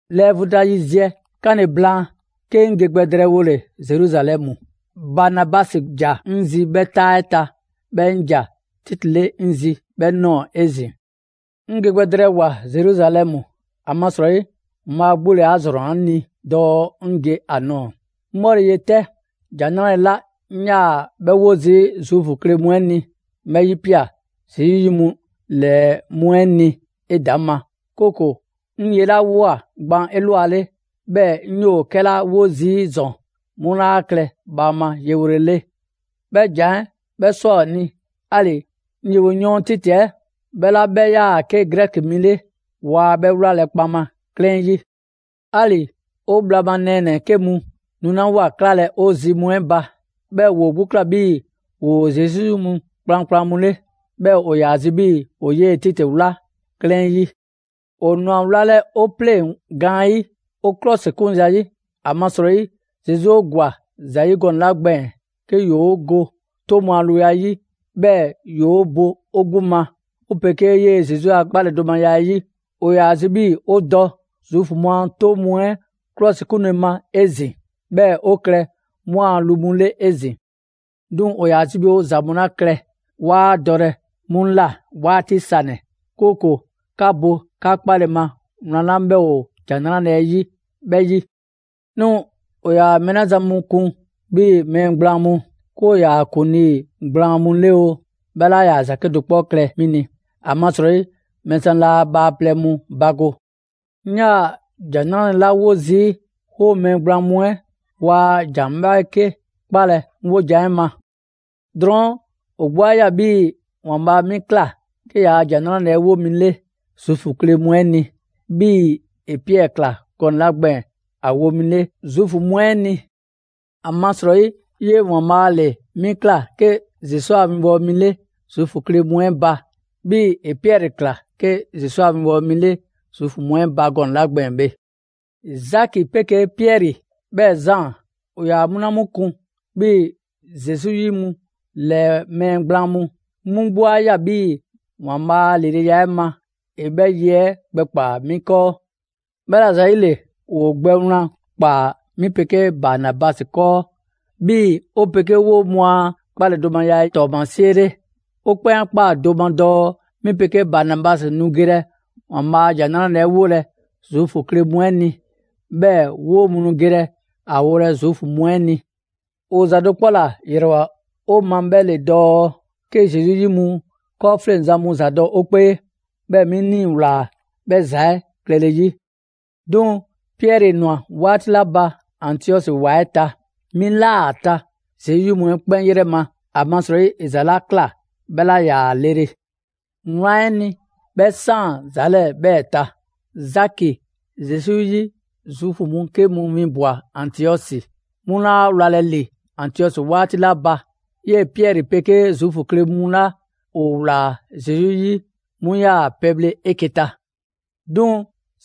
Lɛɛ vu ta yiziɛ 'kanle‑ blaan, 'ke 'ŋ ge gbɛ drɛɛwole Zeruzalɛmu. Banabasi ‑ja 'ŋ zi 'bhɛ 'taa 'ɛ ta, 'bhɛɛ‑ 'ŋ ‑ja Titi 'le 'ŋ zi 'bhɛ ꞊nɔɔ 'ezin‑. 'Ŋ ge gbɛ drɛɛwoa‑ Zeruzalɛmu, ‑amasrɔyi ‑Waanbhaa' 'gbu ‑le 'a ‑zrɔnna 'ŋ ni dɔɔ 'ŋ ge ‑a nɔɔ‑. 'Ŋ 'bhɔle‑ ye 'tɛ, ‑Jan 'Nrale‑ 'la 'ŋ 'yaa‑ 'bhɛ 'wo zii' Zuufu kle mu 'ɛ ni, 'ŋ 'bhɛ 'yipia꞊ Zesu 'yi mu 'ɛ 'lɛɛ mu 'ɛ ni 'edaŋma, 'kooko‑ 'ŋ ye 'la ꞊woa gban 'elwale, 'bhɛɛ‑ 'ŋ 'yoo‑ 'kɛla 'wo zii' ‑zɔn 'mu 'laa klɛ bhaama yewole 'le. 'Bhɛ ‑jan 'ɛ 'bhɛ ꞊swa ‑o ni, 'ali‑ 'ŋ yewoyɔɔn Titi 'ɛ, 'bhɛ 'la 'bhɛ 'yaa‑ 'ke Grɛki mi 'le, waa 'bhɛ 'wlalɛ‑ kpaŋma 'klɛɛn 'yi. 'Ali‑ 'o bhla ma nɛɛnɛ‑ 'ke mu nulawoa 'klalɛ‑ 'o zi mu 'ɛ ba, 'bhɛɛ‑ ‑woo 'gbu ꞊kla 'bhii‑ ‑woo Zesu 'yi mu kplankplan mu 'le. 'Bhɛɛ‑ ‑o ‑yaa zi 'bhii‑ ‑o 'yee‑ Titi 'wla 'klɛɛn 'yi. ‑O ꞊nwa wlalɛ 'o 'pleŋ‑ gaanyi', 'o 'klɔsikun zayi', ‑amasrɔyi Zesu 'o ‑gwa ‑za ‑yi gɔnɛ‑ 'la gbɛɛn‑ 'ke ‑yoo' go 'toŋ mu a luya 'yi, 'bhɛɛ‑ ‑yoo 'o bo 'o 'gbu ma 'o 'pegee 'yee‑ Zesu a 'kpaledomaya 'ɛ 'yi, ‑o ‑yaa ‑a zi' 'bhii‑ ‑o 'bhɛ ‑za 'ɛ 'yidɔ‑. ‑O ‑yaa zi 'bhii‑ 'o dɔ Zuufu mu a 'toŋ mu 'ɛ 'klɔsikunle ma 'ezin‑ 'bhɛɛ‑ 'o klɛ 'mu a lu mu 'le 'ezin‑. 'Duŋ‑ ‑o ‑yaa zi 'bhii‑ ‑o ‑za mu 'la klɛ 'waa dɔlɛ 'mu 'waati sanɛ‑; 'kooko‑ 'ka bo 'ka 'kpale‑ ma wlan 'la 'bhɛ ‑o ‑Jan 'Nrale‑ 'ɛ 'yi 'bhɛ 'yi. 'Duŋ‑ 'o ‑yaa mɛɛ 'la zan mu 'kun 'bhii‑ mɛɛ gblaan mu, 'ke ‑o ‑yaa ‑kuŋlii gblaan mu 'le oo, 'bhɛ 'laa ‑za 'kedo‑ 'kpɔ klɛ 'mi ni, ‑amasrɔyi ‑Waanbhaa' laa bhaaplɛŋ mu bago. 'Ŋ 'yaa‑ ‑Jan 'Nrale‑ 'la 'wo zii', 'woo‑ mɛɛ gblaan mu 'ɛ waa ‑jan 'bhɛɛke 'kpalɛ‑ 'ŋ 'wojan‑ 'ɛ ma. Drɔɔn', ‑o 'gbu 'a ꞊ya 'bhii‑ ‑Waanbhaa' 'mi ꞊kla 'ke ‑yaa' ‑Jan 'Nrale‑ 'ɛ 'wo mi 'le Zuufu kle mu 'ɛ ni, 'bhii‑ ‑e Piɛri ꞊kla gɔnɛ‑ 'la gbɛɛn‑ ‑a wo mi 'le Zuufu mu 'ɛ ni. ‑Amasrɔyi 'yee‑ ‑Waanbhaa' ‑le 'mi ꞊kla 'ke Zesu a winbɔwo mi 'le Zuufu kle mu 'ɛ ba, 'bhii‑ ‑e Piɛri ꞊kla 'ke Zesu a winbɔwo mi 'le Zuufu mu 'ɛ ba gɔnɛ‑ 'la gbɛɛn‑ bhe. Zaki 'pegee Piɛri 'bhɛɛ‑ Zaan, ‑o ‑yaa 'mu 'la kun 'bhii‑ Zesu 'yi mu ‑lɛɛ mɛɛ gblaan mu, 'mu 'gbu 'a ꞊ya 'bhii‑ ‑Waanbhaa' a ‑lileya 'ɛ ma, ‑e 'bhɛ ye 'ɛ gbɛkpaa 'mi 'kɔɔ. 'Bhɛla‑ ‑zayile, ‑woo' gbɛ wlan ꞊kpaa 'mi 'pegee Banabasi 'kɔɔ, 'bhii‑ 'o 'pegee 'woo‑ mu a 'kpaledomaya 'ɛ ‑tɔɔmasie 'le. 'O 'kpɛn 'a ꞊kpaa do ma dɔɔ 'mi 'pegee Banabasi nu gelɛ ‑Waanbhaa' a ‑Jan 'Nrale‑ 'ɛ 'wolɛ Zuufu kle mu 'ɛ ni, 'bhɛɛ‑ 'woo‑ mu nu gelɛ ‑a wolɛ‑ Zuufu mu 'ɛ ni. ‑O ‑za do 'kpɔ ‑la ‑yrɛwoa 'o ma 'bhɛ ‑le dɔɔ 'ke Zesu 'yi mu 'kɔɔfleŋzan mu ‑zadɔ' 'o 'kpee. 'Bhɛɛ‑ 'mi 'ŋ 'nii‑ ꞊wlaa 'bhɛ ‑za 'ɛ klɛle 'yi. 'Duŋ‑ Piɛri ꞊nwa 'waati 'la ba Antiɔsi ‑wa 'ɛ ta, 'mi ꞊laa ‑a ta Zesu 'yi mu 'ɛ 'kpɛn 'yrɛ ma; ‑amasrɔyi ‑e ‑za 'la ꞊kla 'bhɛ 'laa ‑yaa lele. Wlan 'ɛ ni, 'bhɛ 'saan‑ ‑za 'lɛɛ‑ 'bhɛɛ‑ ta. Zaki Zesu 'yi Zuufu mu 'ke mu 'winbwa‑ Antiɔsi. 'Mu 'laa 'wlalɛ‑ ‑li Antiɔsi 'waati 'la ba, 'yee‑ Piɛri 'pegee Zuufu kle mu 'la ‑o ‑wlaa Zesu 'yi 'mu 'yaa‑ pɛbhle 'eke‑ ta. 'Duŋ‑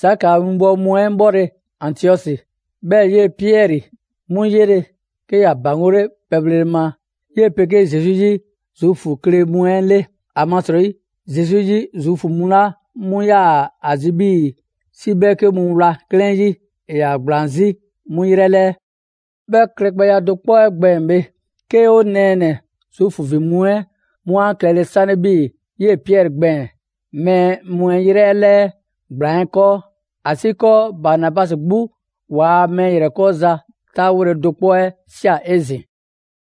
Zaki a winbɔwo mu 'ɛ 'bhɔle‑ Antiɔsi, 'bhɛɛ‑ 'yee‑ Piɛri 'mu 'yele, 'ke ‑ya ‑baŋgole pɛbhlele ma 'yee‑ 'pegee Zesu 'yi Zuufu kle mu 'ɛ 'le; ‑amasrɔyi Zesu 'yi Zuufu mu 'la 'mu 'yaa‑ ‑a zi 'bhii‑ 'si 'bhɛɛke mu wla 'klɛɛn 'yi ‑e ‑yaa ‑gblaan 'zi 'mu 'yrɛ 'lɛɛ. 'Bhɛ klɛgbɛya do kpɔ 'ɛ gbɛɛn‑ bhe, 'ke 'o nɛɛnɛ‑ Zuufu ‑vin mu 'ɛ 'mu a klɛle 'sanle 'bhii‑ 'yee‑ Piɛri gbɛɛn‑ mɛɛ mu 'ɛ ‑yrɛ 'lɛɛ ‑gblaan 'ɛ 'kɔɔ, ‑asiikɔɔ Banabasi 'gbu ‑waa' mɛɛ ‑yrɛkɔɔza 'taawole do 'kpɔ 'ɛ ꞊sia 'ezin‑.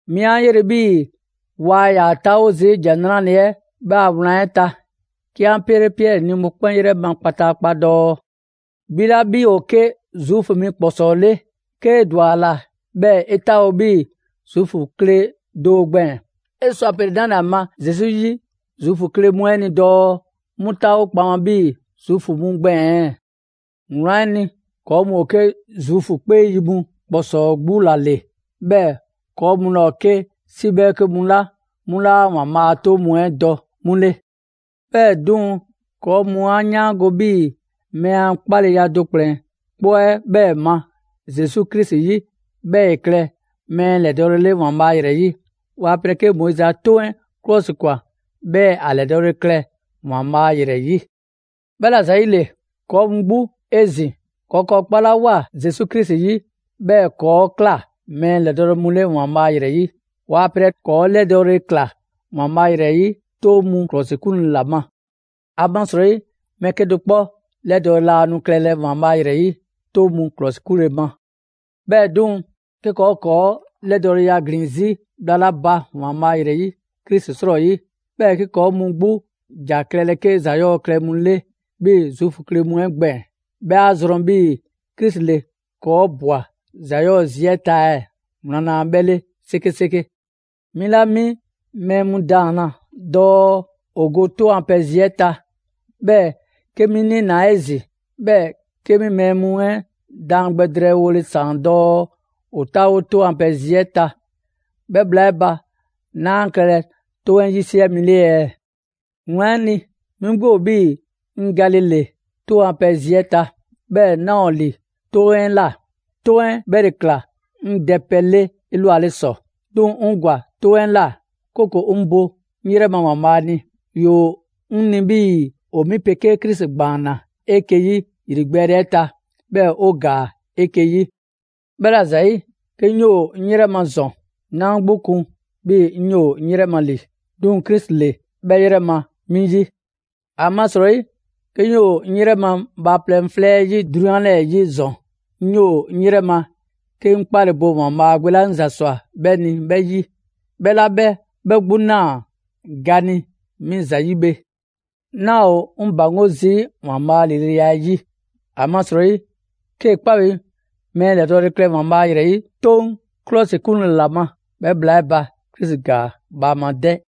'Mi a 'yele‑ 'bhii‑ waa ‑yaa 'taawo zii' ‑Jan 'Nrale‑ 'ɛ 'bhɛ a wlan 'ɛ ta, 'ke 'an 'pele Piɛri ni mɔkpɛn' 'yrɛ ma kpataakpa dɔɔ: «'Bhi 'la 'bhi ‑o 'ke Zuufu mi ‑kpɔsɔɔ 'le, 'kee‑ ‑dwa ‑a ‑la 'bhɛɛ‑ 'e 'taawo‑ 'bhii‑ Zuufu kle do gbɛɛn‑, 'e sɔ ‑a pele‑ 'nale‑ ‑a ma Zesu 'yi Zuufu kle mu 'ɛ ni dɔɔ 'mu 'taawo kpaŋma 'bhii‑ Zuufu mu gbɛɛn‑ ɛɛ?» Wlan 'ɛ ni, ‑kɔɔ' mu ‑o 'ke Zuufu 'kpee yi mu ‑kpɔsɔɔ 'gbu ‑la ‑le, 'bhɛɛ‑ ‑kɔɔ' mu laa ‑o 'ke 'si 'bhɛɛke mu 'la 'mu laa ‑Waanbhaa' a 'toŋ mu 'ɛ dɔ 'mu 'le. 'Bhɛɛ‑ 'duŋ‑, ‑kɔɔ' mu 'a 'yaango‑ 'bhii‑ mɛɛ a 'kpaleya do ‑kplɛn 'kpɔ 'ɛ 'bhɛɛ‑ ma Zesu Krisi 'yi, 'bhɛɛ‑ ‑e klɛ mɛɛ ‑lɛdɔɔle 'le ‑Waanbhaa' ‑yrɛ 'yi, waa pelɛ 'kee‑ Moizi a 'Toŋ 'ɛ ‑klɔsikwan, 'bhɛɛ ‑a ‑lɛdɔɔle klɛ ‑Waanbhaa' ‑yrɛ 'yi. 'Bhɛla‑ ‑zayile, ‑kɔɔ' mu 'gbu 'ezin‑, ‑kɔɔ' ‑kɔɔ' 'kpalawoa Zesu Krisi 'yi, 'bhɛɛ‑ ‑kɔɔ' ꞊kla mɛɛ 'lɛdɔɔle mu 'le ‑Waanbhaa' ‑yrɛ 'yi, waa pelɛ ‑kɔɔ' 'lɛdɔɔle ꞊kla ‑Waanbhaa' ‑yrɛ 'yi 'toŋ mu ‑klɔsikunle ‑la ma. ‑Amasrɔyi, mɛɛ 'kedo‑ 'kpɔ 'lɛdɔɔle laa nu klɛlɛ ‑Waanbhaa' ‑yrɛ 'yi 'toŋ mu 'klɔsikunle ma. 'Bhɛɛ‑ 'duŋ‑, 'ke ‑kɔɔ' ‑o ‑kɔɔ' 'lɛdɔɔleya ‑glin 'zi bhla 'la ba ‑Waanbhaa' ‑yrɛ 'yi Krisi 'srɔyi, 'bhɛɛ‑ 'ke ‑kɔɔ' mu 'gbu ‑ja klɛlɛ 'ke ‑za 'yɔɔ‑ klɛ mu 'le 'bhii‑ Zuufu kle mu 'ɛ gbɛɛn‑, 'bhɛ 'a zrɔn 'bhii‑ Krisi ‑le ‑kɔɔ' ꞊bwa ‑za 'yɔɔ‑ zi 'ɛ ta ɛɛ? Wlan laa 'bhɛ 'le 'sekeseke. 'Mi 'la 'mi mɛɛ mu ‑daanna dɔɔ ‑o go 'toŋ a pɛ zi 'ɛ ta, 'bhɛɛ‑ 'ke 'mi 'niinaa 'ezin‑, 'bhɛɛ‑ 'ke 'mi mɛɛ mu 'ɛ daan gbɛ drɛɛwole ‑saan dɔɔ ‑o 'taawo 'toŋ a pɛ zi 'ɛ ta, 'bhɛ bhla 'ɛ ba, 'naa klɛlɛ 'toŋ 'ɛ 'yisiɛ mi 'le ɛɛ? Wlan 'ɛ ni, 'mi 'gbu ‑o 'bhii‑ 'ŋ gale ‑le 'toŋ a pɛ zi 'ɛ ta. 'Bhɛɛ‑ 'naa ‑o ‑li 'toŋ 'ɛ ꞊la. 'Toŋ 'ɛ 'bhɛ ‑le ꞊kla 'ŋ dɛpɛ 'le 'elwale ‑sɔ. 'Duŋ‑ 'ŋ ‑gwa 'toŋ 'ɛ ꞊la, 'kooko‑ 'ŋ bo 'ŋ 'yrɛ ‑Waanbhaa' ni. ‑Yoo 'ŋ ni 'bhii‑ ‑o 'mi 'pegee Krisi ‑gbaanna 'eke‑ 'yi ‑yrigbɛɛle 'ɛ ta, 'bhɛɛ‑ 'o ‑gaa 'eke‑ 'yi. 'Bhɛla‑ ‑zayi', 'ke 'ŋ 'yoo‑ 'ŋ 'yrɛ ma ‑zɔn, 'naa 'ŋ 'gbu kun 'bhii‑ 'ŋ 'yoo‑ 'ŋ 'yrɛ ma ‑li, 'duŋ‑ Krisi ‑le 'bhɛ 'yrɛ ma 'mi 'yi. ‑Amasrɔyi 'ke 'ŋ 'yoo‑ 'ŋ 'yrɛ ma bhaaplɛŋ 'flɛ 'ɛ 'yi 'drunyan 'lɛɛ‑ 'yi ‑zɔn, 'ŋ 'yoo‑ 'ŋ 'yrɛ ma 'ke 'ŋ 'kpale‑ bo ‑Waanbhaa' Gbe 'la 'ŋ ‑za ꞊swa 'bhɛ ni 'bhɛ 'yi, 'bhɛ 'la 'bhɛ 'bhɛ 'gbu ꞊naa ga ni 'mi ‑zayi' bhe. 'Naa ‑o 'ŋ ‑baŋgo' zii' ‑Waanbhaa' a ‑lileya 'ɛ 'yi. ‑Amasrɔyi, 'kee‑ 'kpa bi mɛɛ ‑lɛdɔɔle klɛ ‑Waanbhaa' ‑yrɛ 'yi 'Toŋ 'klɔsikunle ‑la ma, 'bhɛ bhla 'ɛ ba, Krisi ‑gaa bhaama 'dɛ.